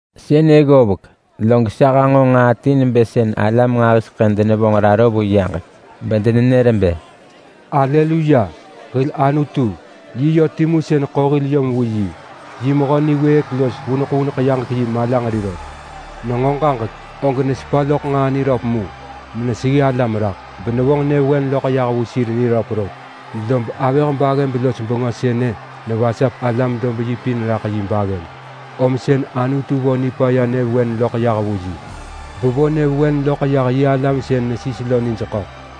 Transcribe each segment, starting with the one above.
Sënë ggovek, log sa hanġo nġaa ti nebë sën alam nġahiseḳë denevonġ raro vu yaġek, bedenenër bë: “Aleluya! Hil Anutu, yi yö timu sën ḳo hil yom vu yi. Yi mehö niwëëk los vuneḳ vuneḳ yaġek-yi malanġeri rot. Nenġo ġaġek, og nesepa loḳ nġaa niröp mu meneseggi alam raḳ, benevonġ nyëvewen loḳ yah vu sir niröp rot. Lob avëh-baggëb-los-bengö sënë nevasap alam-dob-yi pin raḳ yi baggëb, om sën Anutu vo nipaya nyëvewen loḳ yah vu yi, bevo nyëvewen loḳ yah yi alam sën nesis lo nij ḳöḳ.”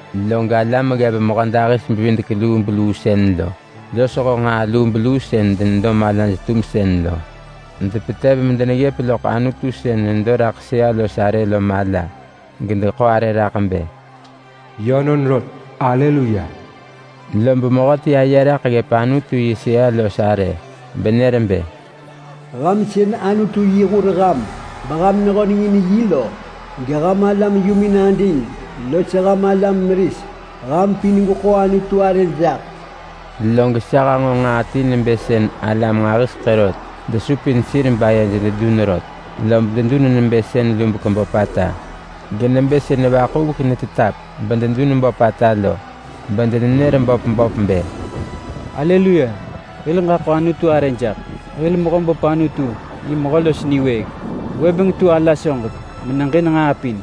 Log alam ggev mehödahis-bevidek-lubeluu sën lo, losho nġaa lubeluu sën denedo malaj-tumsën lo, depetev medeneggëp loḳ Anutu sën nedo raḳ sëa-los-arë lo mala, gedeḳo arë raḳ bë: “Yönon rot! Aleluya!” Lob mehöti aye raḳ ggëp Anutu yi sëa-los-arë, benër bë: “Ham sën Anutu yi hur ham, beham nehönengin yi lo, geham alam yumin ading los ham alam meris, ham pin gweḳo Anutu arë jaḳ!” Log sa hanġo nġaa ti nebë sën alam nġahiseḳë rot desupin sir bedenenër ġaġek, lob dedun nebë sën lubek böpata. Genebë sën vaḳuvek netetap bededun böpata lo, bedenenër böpata bë: “Aleluya! Hil ġaḳo Anutu arë jaḳ! Hil Mehöböp Anutu, yi mehö los niwëëk! Gwëbeng tu ala soġek meneġin nġaa pin!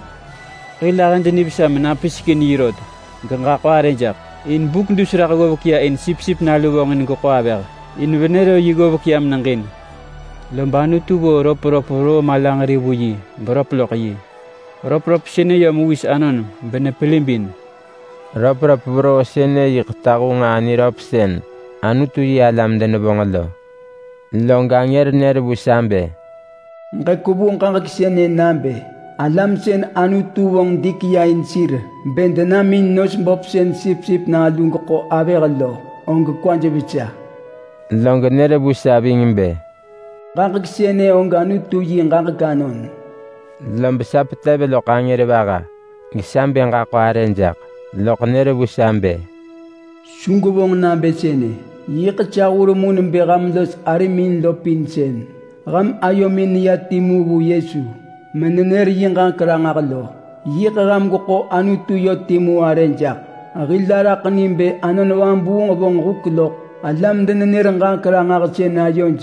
Hil ahëd nivesa menapisek in yi rot geġaḳo arë jaḳ! In buk dus raḳ ggovek ya in Sipsip Nalu vonġin geḳo avëh. In venë ro yi ggovek ya meneġin. Lob Anutu vo röpröp veroo malanġeri vu yi beröp loḳ yi. Röpröp sënë yö mewis anon benepelibin.” (Röpröp veroo sënë yiḳ tahu nġaa niröp sën Anutu yi alam denevonġ lo.) Log angër nër vu sa bë, “Ġekwevu ġaġek sënë nabë: Alam sën Anutu vonġ dik ya in sir bë denam in nos böp sën Sipsip Nalu geḳo avëh lo, og kwaj vesa!” Log nër vu sa ving bë, “Ġaġek sënë og Anutu yi ġaġek anon.” Lob sa petev loḳ angër vaha gesa bë ġaḳo arë jaḳ, loḳ nër vu sa bë, “Su gwevonġ nabë sënë! Yiḳ sa hur mu nebë ham los arim lo pin sën ham ayomin neya timu vu Yesu menenër yi ġaġek ranġah lo. Yiḳ ham gweḳo Anutu yö timu arë jaḳ. Hil araḳ ni bë Anon Vabuung vonġ huk loḳ alam-denenër-ġaġek-ranġahsën ayoj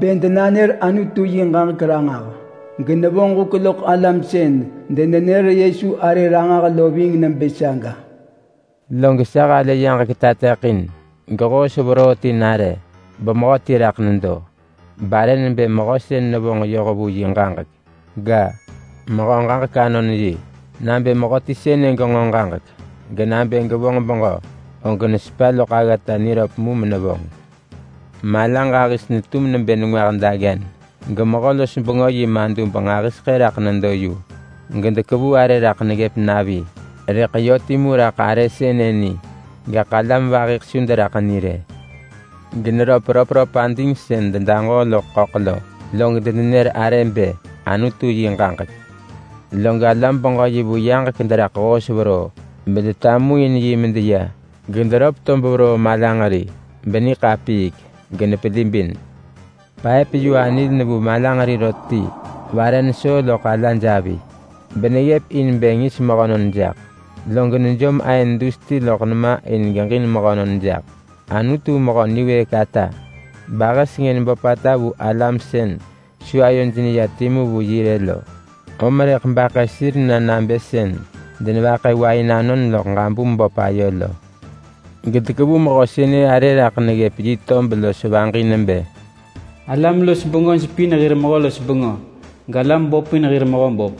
bë denanër Anutu yi ġaġek ranġah, genevonġ huk loḳ alam sën denenër Yesu arë ranġah lo ving nebë saga.” Log sa halë yaġek tateḳin gehoos veroo ti nare. Bemehöti raḳ nedo, barë nebë “Mehö Sën Nevonġ Yoh Vu Yi Ġaġek” ga, “Mehö Ġaġek Anon Yi”. Nabë mehöti sënë genġo ġaġek, genabë gevonġ beġö, og nesepa loḳ aggata niröp mu menevonġ. Mala ġahis netum nebë nengwah daggen, gemehö-los-bengö yi madub nġahiseḳë raḳ nedo yu. Gedekevu arë raḳ neggëp navi, rëḳ yö timu raḳ arë sënë ni, gaḳ alam vahiḳ su deraḳ ni rë. Generöp röpröp ading sën dedaġoo loḳ ḳöḳ lo. Log denenër arë bë, “Anutu yi Ġaġek”. Log alam-beġö-yi vu yaġek deraḳ hoos veroo, bedetamuin yi medeya. Gederöp tob veroo malanġeri beniḳapiik menepelibin. Paëp-yu-anil nevu malanġeri rot ti vare nesoo loḳ alaj avi, beneggëp in bë ngis mehönon jaḳ. Log nejom aën dus ti loḳ nema in geġin mehönon jaḳ. Anutu mehö niwëëk ata, bahë sengën böpata vu alam sën su ayoj neya timu vu yi rë lo, om rëḳ baḳë sir na nabë sën denevaḳë wain anon loḳ ġabum böp ayo lo. Gedekevu mehö sënë arë raḳ neggëp yi tob los vaġi nebë: “ALAM-LOS-BENGÖJ PIN HIR MEHÖ-LOS-BENGÖ, GALAM BÖP PIN HIR MEHÖBÖP.”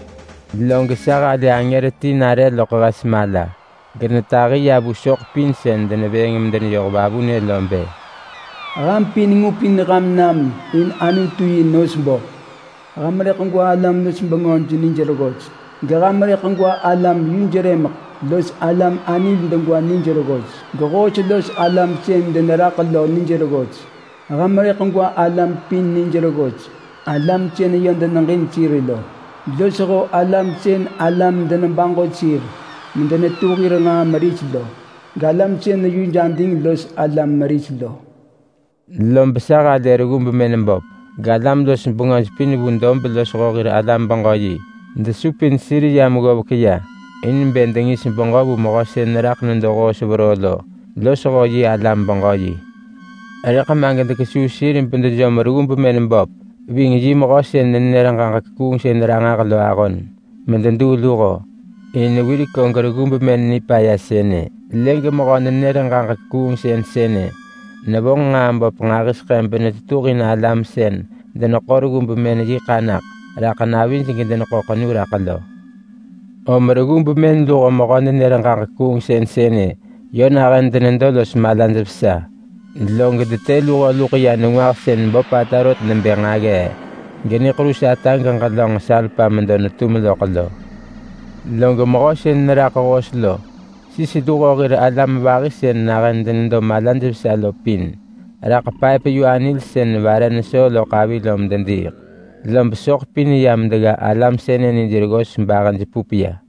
Log sa halë angër ti nare loḳ hes mala. Genetahi ya vu soḳ pin sën denevëëng medeneyoh vavunë lo bë, “Ham pin ngupin ham nam in Anutu yi nos böp. Ham rëḳ gwa alam-los-bengöj nij reggos geham rëḳ gwa alam yuj rëmeḳ los alam anil degwa nij reggos gehoos los alam sën deneraḳ lo nij reggos. Ham rëḳ gwa alam pin nij reggos, alam sën yö deneġin sir lo, losho alam sën alam denebaġo sir medenetu hir nġaa meris lo, galam sën yuj ading los alam meris lo.” Lob sa halë reggu bemën böp galam-los-bengöj pin vu dob losho hir alam-beġö-yi desupin sir yam ggovek ya in bë dengis beġö vu mehö sën raḳ nedo hoos veroo lo losho yi alam-beġö-yi. Rëḳ ma gedekesuu sir bedejom reggu bemën böp ving yi mehö sën nenër-ġaġek-kuungsën-ranġah lo ahon mededuu luho. In wirek og reggu bemën nipaya sënë lë gemehö-nenër-ġaġek-kuungsën sënë nevonġ nġaa böp nġahiseḳë benetetuhin alam sën deneḳo reggu bemën yi ḳanaḳ raḳ navij gedeneḳo ḳenu raḳ lo. Om reggu bemën luho mehö-nenër-ġaġek-kuungsën sënë yö nahën denedo los malaj vesa. Log detë luho luḳ ya nengwah sën böpata rot nebë nġaggee, geniḳerus ata geġelönġ salpa medo netum loḳ lo. Log mehö sën neraḳ hoos lo sis luho hir alam vahi sën nahën denedo vesaj lo pin raḳ paëp-yu-anil sën vare nesoo loḳ avi lo medediiḳ. Log soḳ pin yam degga alam sënë nij reggos bahëj pup ya.